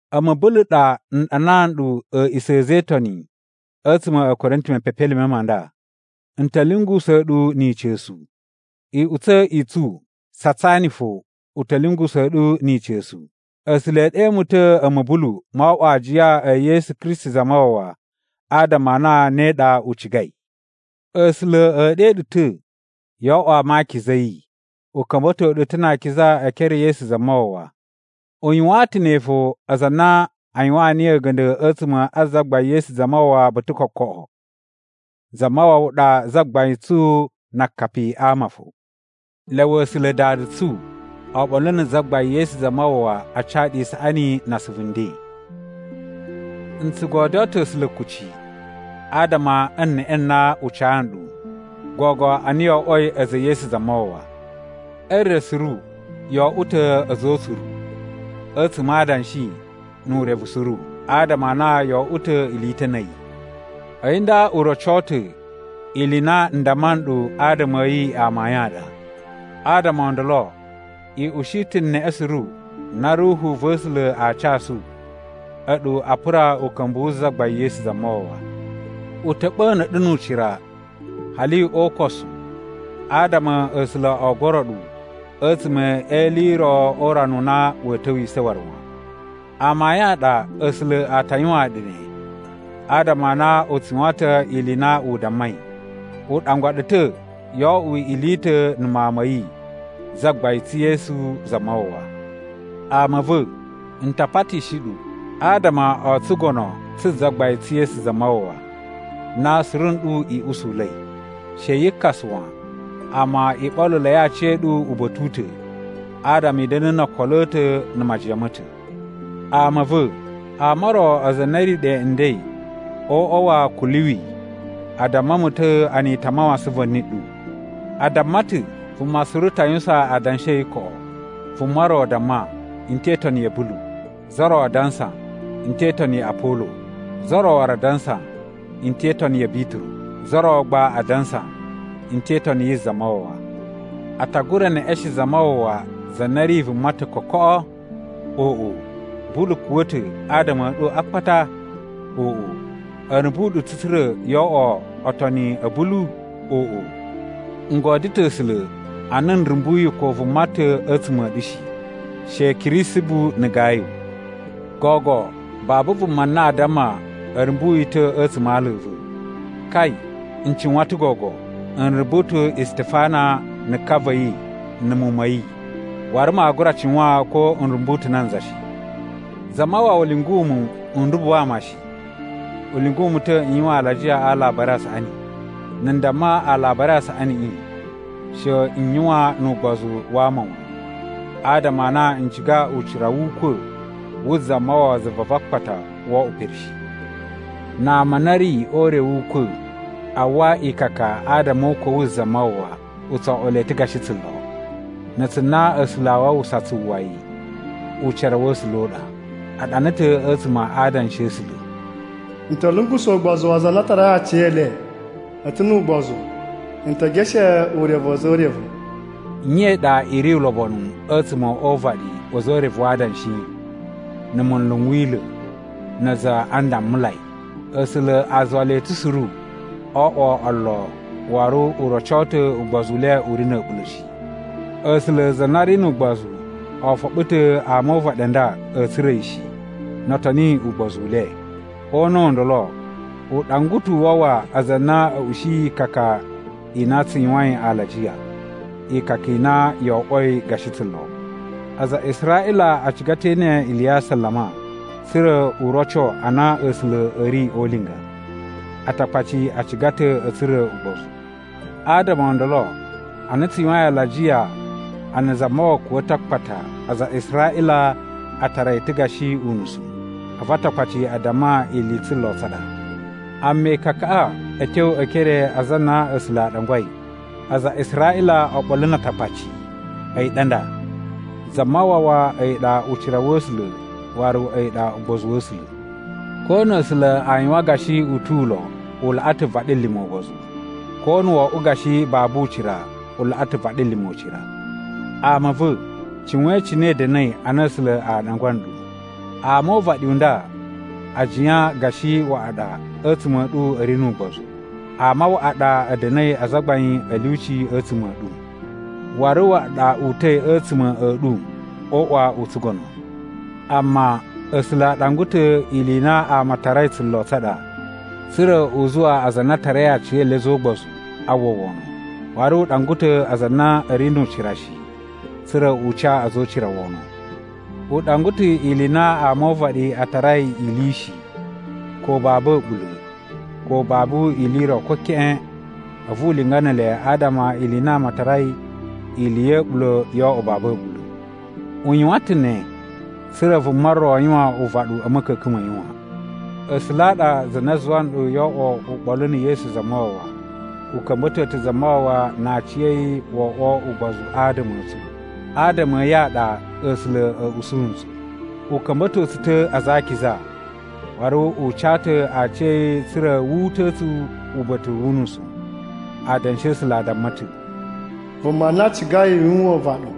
A̱mu Bulu ɗa n ɗanaa nɗu a̱a̱ꞌisa̱ a̱ a̱za̱ e Itoni a̱tsuma̱ a̱ Korinti mepepelime ma nda. N ta̱ lyungusa̱a̱ ɗu ni ica̱su. Iꞌutsa̱ i tsu Satsani fo u ta̱ lyungusa̱a̱ ɗu ni ica̱su. A̱sula̱ e ɗe mu ta̱ a̱mu Bulu, mo oꞌwo aajiya e Yesu Kristi Zamawawa, adama a na ne ɗa u cigai. A̱sula̱ e ɗe ɗu ta̱ yo oꞌwo ama a akiza a̱ yi. U ka̱mba̱to ɗu ta̱ na akiza e ekere e Yesu Zamawawa. U yuwaan ta̱ ne fo aza a na a yuwaan niyi a̱ga̱nda̱ a̱tsuma̱ a Zagbain Yesu Zamawawa ba̱ta̱ kokoꞌo. Zamawawa ɗa Zagbain tsu na akapi ama fo. Lyawa A̱sula̱ Dada tsu oɓolo na̱ Zagbain Yesu Zamawawa a ca ɗu isaꞌani na asuvu nden. N tsu godyoo ta̱ A̱sula̱ kuci adama e neꞌe na u ca nɗu, gogo a na yo oꞌwoi a̱za̱ e Yesu Zamawawa. E re suru yo oꞌwo ta̱ a̱za̱ o utsuru, a̱tsuma̱ a adanshi nu urevu suru adama a na yo oꞌwo ta̱ ili i ta̱ na̱ a̱yi. A̱yi nda u roco ta̱ ili i na n damma nɗu adama a̱ yi amayun a ɗa. Adama o ndolo, i ushi ta̱ neꞌe suru na Ruhu va̱ A̱sula̱ aa casu, a̱ɗu a pura uka̱mbu wu Zagbain Yesu Zamawawa. U ta̱ ɓa̱na̱ ɗu nu ucira hali o ukosu adama A̱sula̱ o goro ɗu a̱tsuma̱ e ili i ro o urana u na wa̱a̱ ta̱wisa̱ waru wan. Amayun a ɗa A̱sula̱ a ta yuwaan ɗu ne, adama a na u tsu yuwan ta̱ ili i na u dammai, u ɗangwa ɗu ta̱ yo oꞌwo ili i ta̱ na̱ Mawun ma̱ yi, Zagbain tsu Yesu Zamawawa. Ama a̱ va̱, n ta patishi ɗu, adama o tsugono tsu Zagbain tsu Yesu Zamawawa, na suru nɗu i usula̱i. She yi kasa wan, amma i ɓoluloi aciya̱ɗu uba̱ta̱ u ta̱ adama i da̱na̱ no okolo a̱ ta̱ na̱ majiyan ma̱ ta̱. Ama a̱ va̱, ama o ro aza a na a̱ ri ɗe nden o uꞌwa wa̱ Kuluwi a damma mu ta̱ a na i ta̱ a mawasan va̱ni ɗu. A damma ta̱ vuma suru ta yuwusan adanshi a̱ yi koꞌo. Vuma ro damma, “N te itoni ya̱ Bulu.” Za ro a dansa “N te itoni ya Apolo.” Za ro waru a dansa, “N te itoni ya̱ Bituru.” Za ro gba a dansa, “N te itoni yi Zamawawa.” A ta gura neꞌeshen Zamawawa za na ri vuma ta̱ kokoꞌo? Oꞌo! Bulu kuwa̱ ta̱ adama a̱ ɗu a akpata? Oꞌo! A̱ rumbu ɗu ta̱ tsa̱ra̱ yoo oꞌwo otoni a̱ Bulu? Oꞌo! N godyo ta̱ A̱sula̱ a na n rumbuyi ko vuma ta̱ a̱tsuma̱ a̱ ɗu shi, she Kirisibu na̱ Gayu. Gogo babu vuma na aa damma a̱ rumbu yi ta̱ a̱tsuma̱ a ala a̱ va̱. (Kai, n cuwan ta̱ gogo! N rumbu ta̱ Istifana na̱ ka va̱ yi na̱ muwun ma̱ yi, waru maa gura cuwan ko n rumbu ta̱ nanza shi.) Zamawawa lyungu mu n rumbu ama shi. U lyungu mu ta̱ n yuwan alajiya a Alabari a Saꞌani. Na̱ n damma Alabari a Saꞌaniꞌi, she n yuwan nu ugbozu wa ama wan, adama a na n ciga ucira wu ukwa̱ wu Zamawawa zuva va akpata wo oꞌwo pere shi. Na ama a na a̱ ri o ure wu ukwa̱ a uwwa ikaka adama o ukwa̱ wu Zamawawa, u tso oꞌwo le ta̱ gashi tsulo. Na̱ a̱tsu na A̱sula̱ a wawusa tsu uwwa yi, ucira wa̱ A̱sula̱ u ɗa. A ɗana ta̱ a̱tsuma̱ a Adanshi a̱ A̱sula̱: “N ta̱ lungusa̱ ugbozu wa aza a na a tarai aciyele a̱ ta̱ nu ugbozu. N te geshe urevu wa̱ a̱za̱ o urevu.” Nye i ɗa i ri ulobonu a̱tsuma̱ o uvaɗi wa̱ a̱za̱ o urevu wa adanshi, na̱ munlu n wila̱, na aza a ndammulai? A̱sula̱ a zuwa le ta̱ suru o oꞌwo olo waru u roco ta̱ ugbozu u le u ri na̱ a̱ɓula̱ shi. A̱sula̱ za na ri nu ugbozu o foɓo ta̱ ama o uvaɗi u nda a̱a̱ tsura̱ yi shi, no o toni ugbozu u le. O una̱ u ndolo, u ɗangwa ta̱ u wawa aza a na a̱ ushiyi ikaka i na tsu yuwain alajiya, ikaka i na yo oꞌwoi gashi tsulo. Aza a Israꞌila a ciga ta̱ ee ene ili ya asalama tsa̱ra̱ u roco a na A̱sula̱ a̱ ri o ulinga. Atakpaci a ciga ta̱ a̱ tsura̱ ugbozu. Adama o ndolo, ana tsu yuwain alajiya a na Zamawawa kuwa̱ ta̱ a akpata, aza a Israꞌila a tara yi ta̱ gashi unusu, a̱vu Atakpaci a damma ili i tsulo tsa ɗa. Amma ikakaꞌa a̱ tyo e ekere a aza a na A̱sula̱ a ɗangwai, aza a Israꞌila oɓolo na Atakpaci, a̱yi ɗa nda: Zamawawa, a̱yi ɗa ucira wa̱ A̱sula̱ waru a̱yi ɗa ugbozu wa̱ A̱sula̱. Ko na̱ A̱sula̱ a yuwan gashi u tu ulo, u laꞌa ta̱ vaɗilima̱ ugbozu, ko na̱ wo oꞌwo gashi babu ucira, u laꞌa ta̱ vaɗilima̱ ucira. Ama a̱ va̱, cuwain cine i da̱na̱i ana A̱sula̱ a ɗangwa nɗu. Ama o uvaɗi u nda a jiyan gashi waꞌa ɗa a̱tsuma̱ a̱ ɗu a̱ ri nu ugbozu. Ama waꞌa ɗa a̱ da̱na̱i azagbain a̱ lyuci a̱tsuma̱ a̱ ɗu. Waru waꞌa ɗa uta̱i a̱tsuma̱ a̱ ɗu o uꞌwa u tsugono. Amma, A̱sula̱ a ɗangwa ta̱ ili i na ama a tarai tsulo tsa ɗa tsa̱ra̱ u zuwa aza a na a tarai aciyele a̱za̱ o ugbozu a uwwa wono. Waru u ɗangwa ta̱ aza a na a̱ ri nu ucira shi, tsa̱ra̱ u ca a̱za̱ o ucira wono. U ɗangwa ta̱ ili i na ama o uvaɗi a tarai ili shi, ko babu a̱ɓula̱, ko babu ili i ro ko keꞌen, a̱vu u linga ne ele adama ili i na ama a tarai ili ya̱ a̱ɓula̱ yo oꞌwo babu a̱ɓula̱. U yuwan ta̱ ne tsa̱ra̱ vuma ro yuwan uvaɗu a̱ ma̱ka̱ka̱n ma̱ yi wan. A̱sula̱ a ɗa za na zuwa nɗu yo oꞌwo uɓolu na̱ Yesu Zamawawa. U ka̱mba̱to ta̱ Zamawawa na aciya̱yi wo oꞌwo ugbozu adama a̱ tsu. Adama a̱ yi a ɗa A̱sula̱ a̱ usu ntsu. U ka̱mba̱to tsu ta̱ aza a akiza, waru u ca ta̱ aciya̱yi tsa̱ra̱ wu uta̱a̱ tsu uba̱ta̱ wu unusu. Adanshi a̱ A̱sula̱ a damma ta̱, “Vuma na cigai yuwan uvaɗu,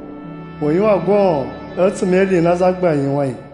u yuwan goon a̱tsuma̱ e ili i na Zagbain yuwain.”